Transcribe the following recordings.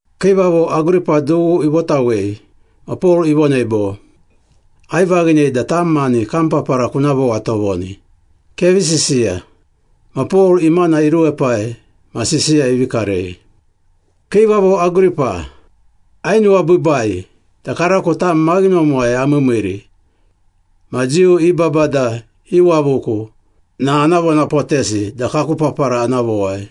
Kiivavo Agripa dughu ivotawei ma Pol ivonei bo, “Aivaghinei da tam mani kam papara kuna vowa tovoni. Kevi sisiya.” Ma Pol imana iruepai ma sisiya ivi karei. “Kiivavo Agripa, ainuwabiibai da karako tam maghinomuwai amiimiiri ma Jiu i babada iwavuku na ana vonapotesi da kaku papara ana vowai.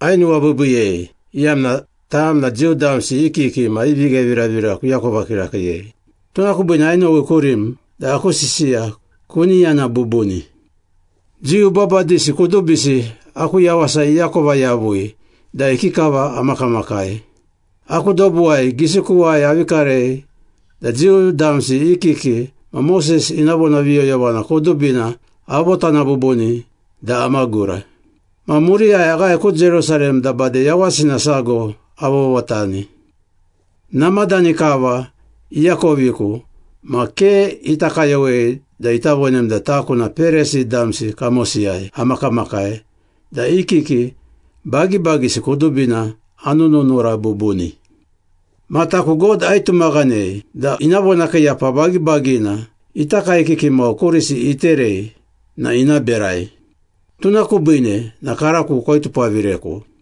Ainuwabiibiiyei, iyamna tam na Jiu damsi i kiki ma i vigheviravira kuakova kirakiiyei. Tuna kubiine ainowi kurim da aku sisiya kuni yana bubuni.” “Jiu babadisi kudubisi aku yawasa iakova yavui da ikikava amakamakai. Aku dobuwai, gisikuwai avi karei da Jiu damsi i kiki ma Moses ina vonaviyoyovana kudubina avotana bubuni da amagura. Ma muriyai aghae ku Jerusalem da bade yawasina sago avovotani. Namadani kava iakoviku ma ke ita kayowei da ita vonem da taku na Perisi damsi kamosiyai amakamakai da i kiki bagibagisi kudubina anununura bubuni. Ma taku God aitumaghanei da ina vonakiiyapa bagibagina ita kaekiki mau kurisi iterei na ina berai. Tuna kubine na karako koitupavireku.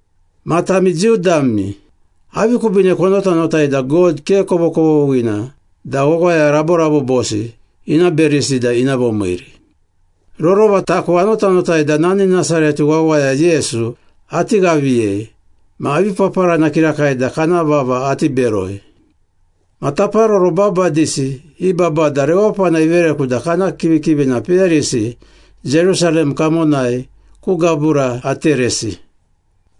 Ma tami Jiu dami, avi kubiine konotanotai da God ke kovokovoghina da wawaya raborabobosi ina berisi da ina vomiiri?” “Rorova taku anotanotai da nani Nasaret wawaya Yesu ati ghaviyei ma avi paparana kirakai da kana vava ati beroi. Ma taparoro babadisi i babada rewapana ivereku da kana kivikivina peyarisi Jerusalem kamonai ku gabura ateresi.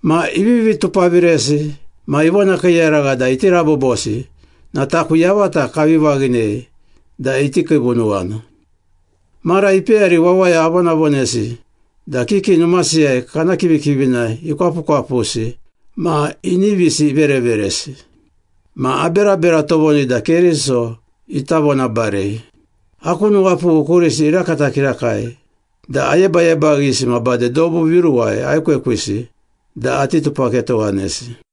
Ma ivivi tupaviresi ma ivonakiiyaragha da iti rabobosi na taku yavata kavi vaghinei da iti kiivunuwana. Mara ipeyari wawaya avonavonesi da kiki numasiyai kana kivikivina ikwapukwapusi ma inivisi ivereveresi. Ma aberabera tovoni da Keriso ita vonabarei. Aku nuwapughu kurisi irakata kirakai da ayebayebaghisi ma bade dobu viruwai aekwekwisi da ati tupaketowanesi.”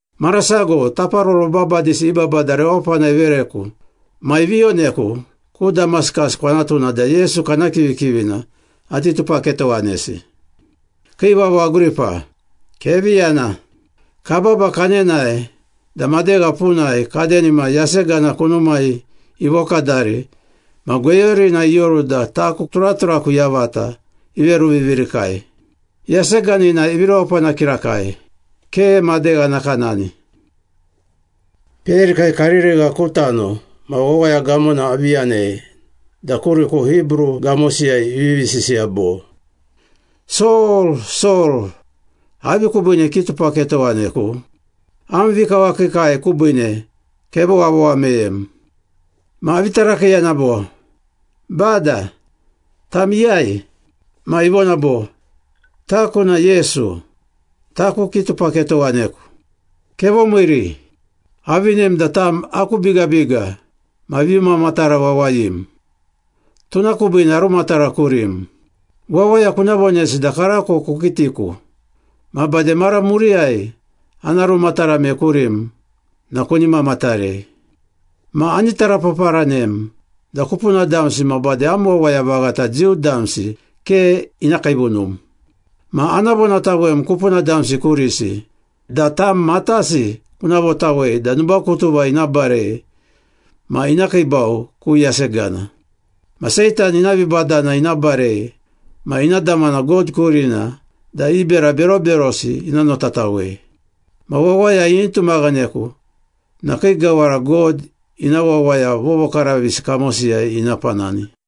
“Mara sago taparoro babadisi i babada rewapana ivereku ma ivi yoneku ku Damaskas kwanatuna da Yesu kana kivikivina ati tupaketowanesi. Kiivavo Agripa, kevi yana. Kababa kanenae da madegha punai kadenima yasegana kunumai ivokadari ma gweyurina ioru da taku turaturaku yavata iveruvivirikai. Yaseganina ivi rewapana kirakai, ke madegha nakanani. Peyarikai karirigha ku tano ma wawaya gamona avi yanei da kuriku Hibru gamosiyai ivivi sisiya bo, ‘Sol, Sol, avi kubiine kitupaketowaneku? Am vikawakiikai kubiine kevowavowa meyem.’ Ma avi tarakiiyana bo, ‘Bada, tam iyai?’ Ma ivona bo, ‘Taku na Yesu, taku kitupaketowaneku. Kevomiiri. Avinem da tam aku bigabiga ma vimamatara wawayim, tuna kubiine arumatara kurim. Wawaya kuna vonesi da karako kukitiku, ma bade mara muriyai ana rumatarame kurim na kuni mamatarei. Ma ani tarapaparanem da kupuna damsi ma bade am wawaya vaghata Jiu damsi ke ina kiivunum. Ma ana vonatawem kupuna damsi kurisi da tam matasi kuna votawei da nubakutuva ina barei ma ina kiibau ku yasegana. Ma Seitan ina vibadana ina barei ma ina damana God kurina da i bera beroberosi ina notatawei. Ma wawaya ini tumaghaneku na kii gawara God ina wawaya vovokaravisi kamosiyai ina panani.’”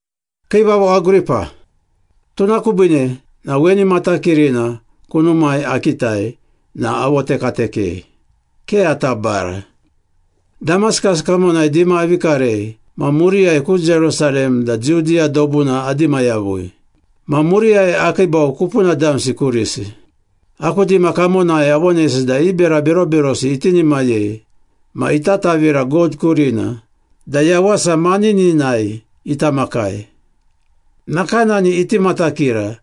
“Kiivavo Agripa, tuna kubiine na weni matakirina kunumai akitai na avotekatekei, ke ata bara. Damaskas kamonai dima avi karei ma muriyai ku Jerusalem da Judiya dobuna adima yavui. Ma muriyai akiibau kupuna damsi kurisi. Aku dima kamonai avonesi da i bera beroberosi itinimayei ma ita tavira God kurina da yawasa manininai ita makai, nakanani iti matakira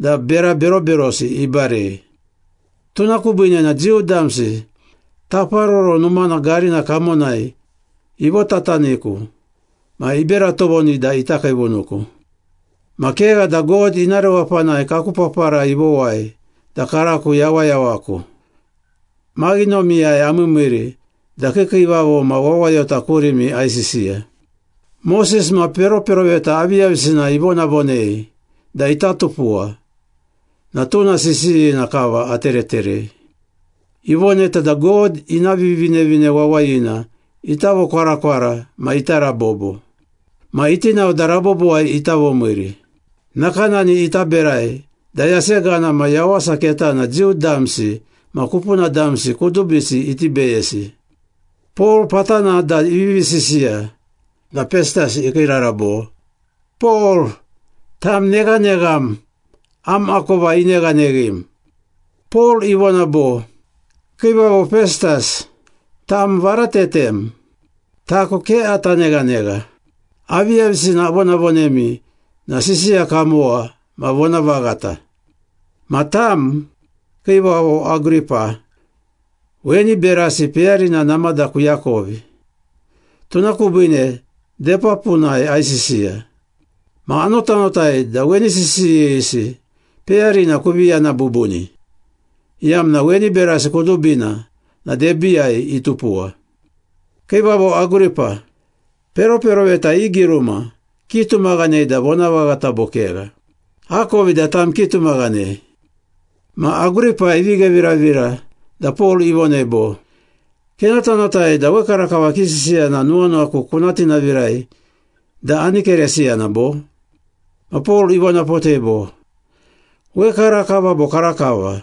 da bera beroberosi ibarei. Tuna kubiine na Jiu damsi Taparoro Numana garina kamonai ivotataniku ma ibera tovoni da ita kiivunuku. Ma kegha da God ina rewapanai kaku papara ivowai da karako yawayawaku, maghinomiyai amiimiiri da kiikiivavo ma wawayota kurimi aisisiya. Moses ma peroperoveta aviyavisina ivonavonei da ita tupuwa, na tuna sisiyina kava atereterei. Ivoneta da God ina Vivinevine Wawayina ita vokwarakwara ma ita rabobo. Ma iti nao da rabobowai ita vomiiri. Nakanani ita berai da yasegana ma yawasa ketana Jiu damsi ma kupuna damsi kudubisi iti beyesi.” Pol patana da ivivi sisiya na Pestas ikiirara bo, “Pol, tam neghanegham! Am akova ineghaneghim.” Pol ivona bo, “Kiivavo Pestas, tam varatetem. Taku ke ata neghanegha. Aviyavisina avonavonemi na sisiya kamowa ma vonavaghata. Ma tam, Kiivavo Agripa, weni berasi peyarina namada kuakovi, tuna kubiine debapunai aisisiya. Ma anotanotai da weni sisiyisi peyarina kuvi yana bubuni, iyamna weni berasi kudubina na debiiyai itupuwa. Kiivavo Agripa, peroperoveta i giruma kitumaghanei da vonavaghata bo kegha? Akovi da tam kitumaghanei.” Ma Agripa ivi gheviravira da Pol ivonei bo, “Kenotanotai da wekarakava kisisiya na nuwanuwaku kuna tinavirai da ani Keresiyana bo?” Ma Pol ivonapotei bo, “Wekarakava bo karakava,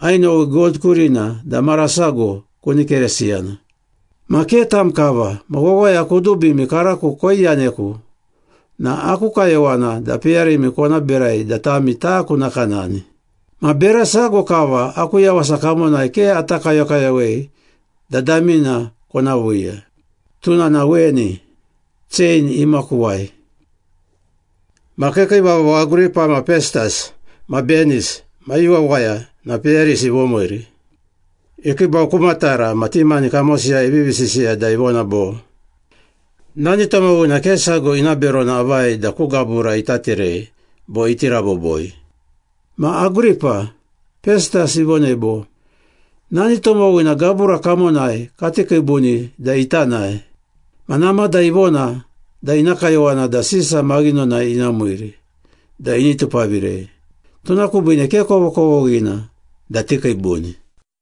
ainowi God kurina da mara sago kuni Keresiyana. Ma ke tam kava ma wawaya kudubimi karako koiyaneku na aku kayowana da peyarimi kona berai da tami taku nakanani. Ma bera sago kava aku yawasa kamonai ke ata kayokayowei da damina kona viiya. Tuna na weni, chein imakuwai.” Ma kiikiivavo Agripa ma Pestas ma Benis ma i wawaya na peyarisi ivomiiri. Ikiibau ku matara ma ti mani kamosiyai ivivi sisiya da ivona bo, “Nani tomowina ke sago ina berona avai da ku gabura ita terei bo iti raboboi.” Ma Agripa, Pestas ivonei bo, “Nani tomowina gabura kamonai kati kiibuni da ita nae. Ma namada ivona da ina kayowana da Sisa maghinonai ina miiri da ini tupavirei. Tuna kubiine ke kovokovoghina da tikiibuni.”